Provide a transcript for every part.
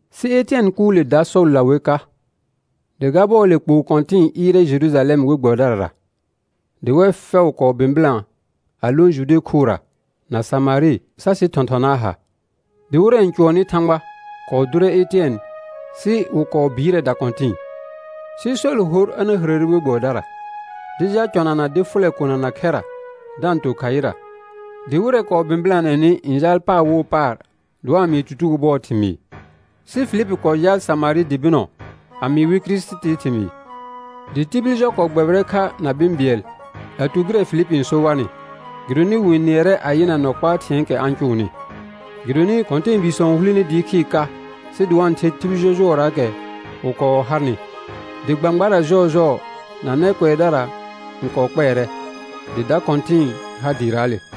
Sɩ Etɩɛn kʋʋle dar Sɔlla wer ka. Dɩ ga bɔɔle kpoo kɔ̃tɩ̃ɩ ɩɩrɛ Jerujalɛm we gbɛbɩdarara, dɩ wɛr fɛʋ kɔɔ bɩ̃bɩlã a lõ Jude khʋra na Samarɩ sa sɩ thɔ̃thɔnaa ha. Dɩ wɩrɛ n cʋɔnnɩ Thãgba kɔɔ dʋrɛ Etɩɛn sɩ wɩ kɔɔ bɩɩrɛ dakɔ̃tɩ̃ɩ. Sɩ Sɔl hor a na hərəre we gbɛbɩdara, dɩ jal cɔnana dɩ fʋlɛ kona na khɛra da-n to khaɩra. Dɩ wɩrɛ kɔɔ bɩ̃bɩlanɛnɩ n jaal paar wo paar dɩ wa-n mɩɩ tutugo bʋɔɔ thɩmɩɩ. Sɩ Filipi kɔɔ jaal Samarɩ dɩ bɩnɔ a mɩɩ wɩ Kirisitii thɩmɩɩ. Dɩ tibil jɔ kɔɔ gbɛbɩrɛ kha na bɩ̃ bɩɛl a tu gɩrɛ Filipi n so warnɩ, gɩdonɩ wɩ-n nɩɛrɛ a yɩna nɔ kpaa thɩ̃ɛɛkɛ a-n cʋʋnɩ. Gɩdonɩ kɔ̃tɛɛbiisɔ n hulene dɩɩ khɩɩr ka sɩ dɩ wa-n the tibil jɔjʋɔraakɛ wɩ kɔɔ harnɩ, dɩ gbãgbara jɔɔjɔɔ na nɛ kʋɛdara n kɔɔ kpɛɛrɛ; dɩ da kɔ̃tɩ̃ɩ har dɩɩraale.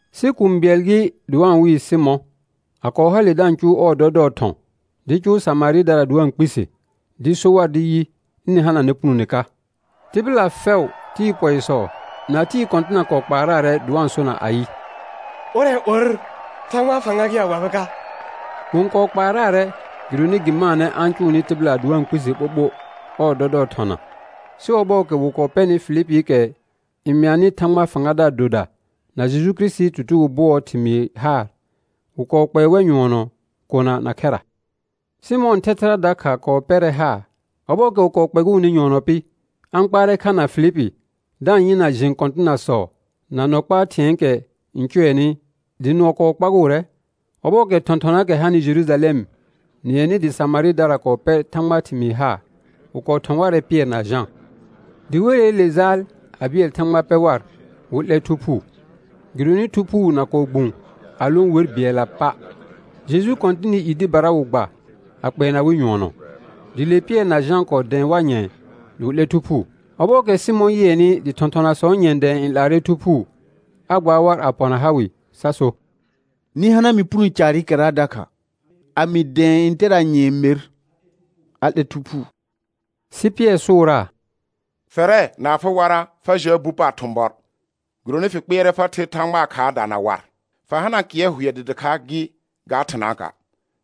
Sɩ kũu bɩɛl gɩ dɩ wa-n wɩɩ Sɩmɔ̃, a kɔɔ hale da-n cʋʋ ɔɔ dɔdɔɔ thɔ̃ dɩɩ cʋʋ Samarɩdara dɩ wa-n kpise dɩ so war dɩ yɩ, ɩnɩ hananɛ punone ka. Tɩbɩla fɛʋ, tɩɩ pɔɩsɔ, na tɩɩ kɔ̃tɩna kɔɔ kpaaraarɛ dɩ wa-n sona ayɩ: Ʋrɛ or Thãgbaa fãga gɩ a wabɩ ka. Wɩ-n kɔɔ kpaaraarɛ gɩdonɩ gɩ maanɛ a-n cʋʋnɩ tɩbɩla dɩ wa-n kpise ɓoɓo ɔɔ dɔdɔɔ thɔna. Sɩ ɔbɔɔkɛ wɩ kɔɔ pɛrnɩ Filipiikɛ n mɩanɩ Thãgbaa fãgadaar doda na Jeju Kirisitii tutugo hʋɔɔ thɩmɩɩ haar, wɩ kɔɔ kpɛɛ wɛr nyʋɔnɔ kona na khɛra. Sɩmɔ̃ɔ thɛthɛra dakha kɔɔ pɛrɛ haar; ɔbɔɔkɛ wɩ kɔɔ kpɛgʋʋnɩ nyʋɔnɔ pɩ, a-n kpaarɛ kha na Filipi da-n yɩna jẽ kɔ̃tɩnasɔ na nɔ kpaa thɩ̃ɛɛkɛ n cʋɛnɩ, dɩ nʋɔ kɔɔ kpagʋʋrɛ. Ɔbɔɔkɛ thɔ̃thɔnaakɛ hanɩ Jerujalɛm nɩɛnɩ dɩ Samarɩdara kɔɔ pɛr Thãgbaa thɩmɩɩ haar, wɩ kɔɔ thɔ̃ warɛ Pɩɛr na Jã. Dɩ weleele jaal a bɩɛl Thãgba pɛ war wɩ 'lɛ Thu Phuu. Gɩdonɩ Thu Phuu na kɔɔ gbũ a lõ wer bɩɛlla pa'; Jeju Kɔ̃tɩnɩ i dɩbara wɩ gba a kpɛɛna wɩ nyʋɔnɔ. Dɩ le Pɩɛr na Jã kɔɔ dɛ̃ɛ war nyɛ̃ɛ dɩ wɩ 'lɛ Thu Phuu. Ɔbɔɔkɛ Sɩmɔ̃ yɩɛnɩ dɩ thɔ̃thɔnasɔɔ nyɛ̃ dɛ̃ɛ n 'laarɛ Thu Phuu, a gbaar war a pɔna ha wɩ sa so: Nɩ ha mɩ puno caarɩkɛra dakha, a mɩ dɛ̃ɛ ntɛra nyɛ̃ɛ mer a 'lɛ Thu Phuu. Sɩ Pɩɛr sʋʋraa: Fɛrɛ na afɩ warra fa jal bu paar thʋ̃bɔr, gɩdonɩ fɩ kpɩɛrɛ fa ther Thãgbaa khaarda na war. Fa hana kɩɛr hʋɛ dɩ dɩkha gɩ ga thɩnaaka',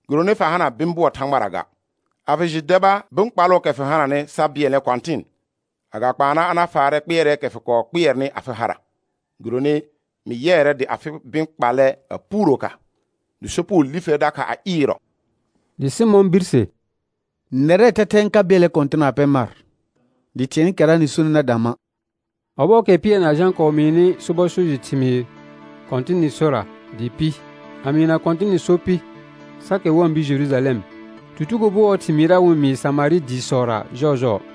gɩdonɩ fa hana bɩ̃ bʋɔ Thãgbara ga. A fɩ jɩ deba bɩ̃ kpalʋʋkɛ fɩ hananɩ sa bɩɛlnɛ Kɔ̃tɩn, agakpaana a na faarɛ kpɩɛrɛɛkɛ fɩ kɔɔ kpɩɛrnɩ afɩ hara; gɩdonɩ mɩ yɩɛrɛ dɩ afɩ bɩ̃ kpallɛ a puuro ka, dɩ sopugo li fer dakha a ɩɩrɔ. Dɩ Sɩmɔ̃ birse: Nɛrɛɛ thɛthɛ n ka bɩɛlnɛ Kɔ̃tɩn na pɛ mar dɩ thɩ̃ɛɛkɛra nɩ sonɩ na dã ma'. Ɔbɔɔkɛ Pɩɛr na Jã kɔɔ mɩɩnɩ sobɔ so jɩ thɩmɩɩr Kɔ̃tɩnɩ sora dɩɩ pɩ, a mɩɩna Kɔ̃tɩnɩ so pɩ sa kɛr wa-n bir Jerujalɛm, tutugo bʋɔɔ thɩmɩɩra wɩ-n mɩɩ Samarɩ dɩɩsɔra jɔɔjɔɔ.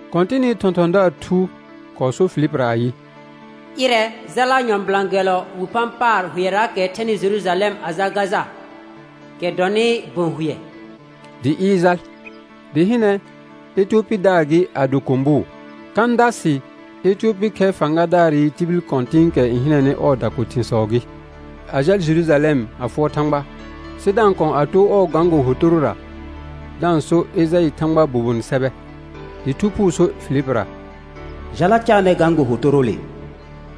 Kɔ̃tɩnɩ thɔ̃thɔ̃daar thu kɔɔ sor Filipira ayɩ: Ɩrɛ, jala nyɔ̃bɩlã gɛllɔ wi phã paar hʋɛraakɛ thɛnɩ Jerujalɛm a jal Gaja, kɛ dɔnɩ bə̃ hʋɛ. Dɩ ɩɩr jal. Dɩ hɩnɛ, Etiyopidaar gɩ a do kʋ̃bʋʋ. Kãdasɩ Etiyopi khɛ fãgadaarɩ tibil kɔ̃tɩ̃ɩkɛ n hɩnɛnɩ ɔɔ dako thɩ̃sɔ gɩ, a jal Jerujalɛm a fʋɔr Thãgba, sɩ da-n kɔ̃ a too ɔɔ gãgo hotorora da-n so Ejaɩ Thãgbaa bobonɩ sɛbɛ. Dɩ Thu Phuu so Filipira: Jala caanɛ gãgo hotoroole.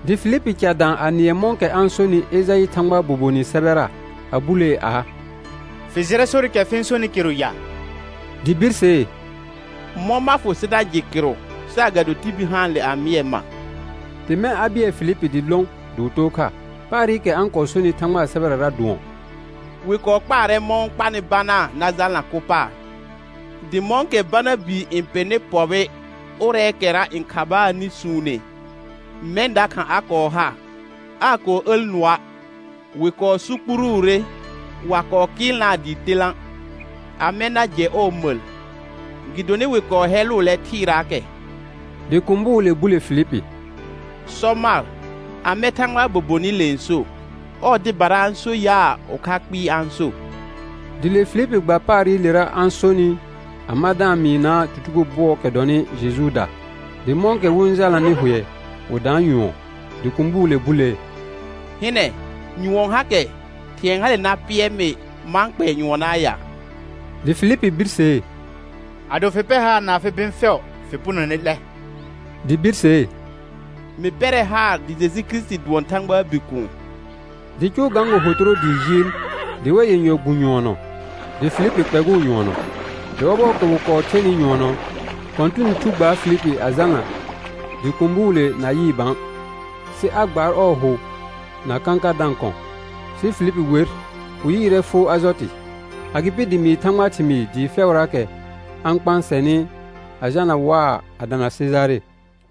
Dɩ Filipi ca dã a nɩɛ mɔ̃kɛ a-n sonɩ Ejaɩ Thãgbaa bobonɩ sɛbɛra, a bulee aa: Fɩ jɩrɛ sorɩkɛ fɩ-n sonɩ kɩrʋ ya? Dɩ birsee: Mɔ̃ ma fʋ sɩ na jɩ kɩrʋ saagado tibil haanle a mɩɛ ma? Dɩ mɛ̃ a bɩɛl Filipi dɩ lõ dɩ wɩ too kha. Paarɩkɛ a-n kɔɔ sonɩ Thãgbaa sɛbɛrara dʋɔn: «Wɩ kɔɔ kpaarɛ mɔ̃ wɩ-n kpanɩ banaa na jalna kʋ paar. Dɩ mɔ̃kɛ bana bii n pɩrnɩ pɔbɩ ʋrɛɛkɛra n khabaanɩ suune, mɛ̃ dakha a kɔɔ ha, aa kɔɔ əl nʋɔa'. Wɩ kɔɔ sukpuruure, wa kɔɔ kɩɩlnaa dɩɩ telã', amɛ na jɛ ɔɔ məl? Gɩdonɩ wɩ kɔɔ hɛlʋʋlɛ thɩɩraakɛ.» Dɩ kʋ̃bʋʋle bule Filipi: Sɔ mar, amɛ Thãgbaa bobonɩle n so? Ɔɔ dɩbara a-n so yaa, ʋkha kpɩɩ a-n so? Dɩ le Filipi gba paarɩlera a-n sonɩ a ma da-n mɩɩnaa tutugo bʋɔɔkɛ dɔnɩ Jejuuda. Dɩ mɔ̃kɛ wɩ-n jalnanɩ hʋɛ wɩ daan nyʋɔn. Dɩ kʋ̃bʋʋle bulee: Hɩnɛ, nyʋɔn hakɛ. Thɩ̃ɛ hale na pɩɛr mɩ ma-n kpɛɛ nyʋɔnɔaa ya? [Dɩ Filipi birsee: Ado fɩ pɛr haar na afɩ bɩ̃ fɛʋ fɩ punone 'lɛ. Dɩ birsee: Mɩ pɛrɛ haar dɩ Jeju Kirisiti dʋɔn Thãgbaa Bikuun.] Dɩ cʋʋ gãgo hotoro dɩɩ jɩɩl dɩ wɛr yenyɔ gbũ nyʋɔnɔ, dɩ Filipi kpɛgʋʋ nyʋɔnɔ. Dɩ ɔbɔɔkɛ wɩ kɔɔ thenɩ nyʋɔnɔ, Kɔ̃tɩnɩ Thu gbaar Filipi a jalna dɩ kʋ̃bʋʋle na yɩɩ bã, sɩ a gbaar ɔɔ hʋ na kãkar da-n kɔ̃. Sɩ Filipi wer, wɩ yɩɩrɛ foo Ajɔtɩ. Agɩpɩ dɩ mɩɩ Thãgbaa thɩmɩɩ dɩɩ fɛʋraakɛ a-n kpãsɛnɩ a jalna waa a dana Sejare.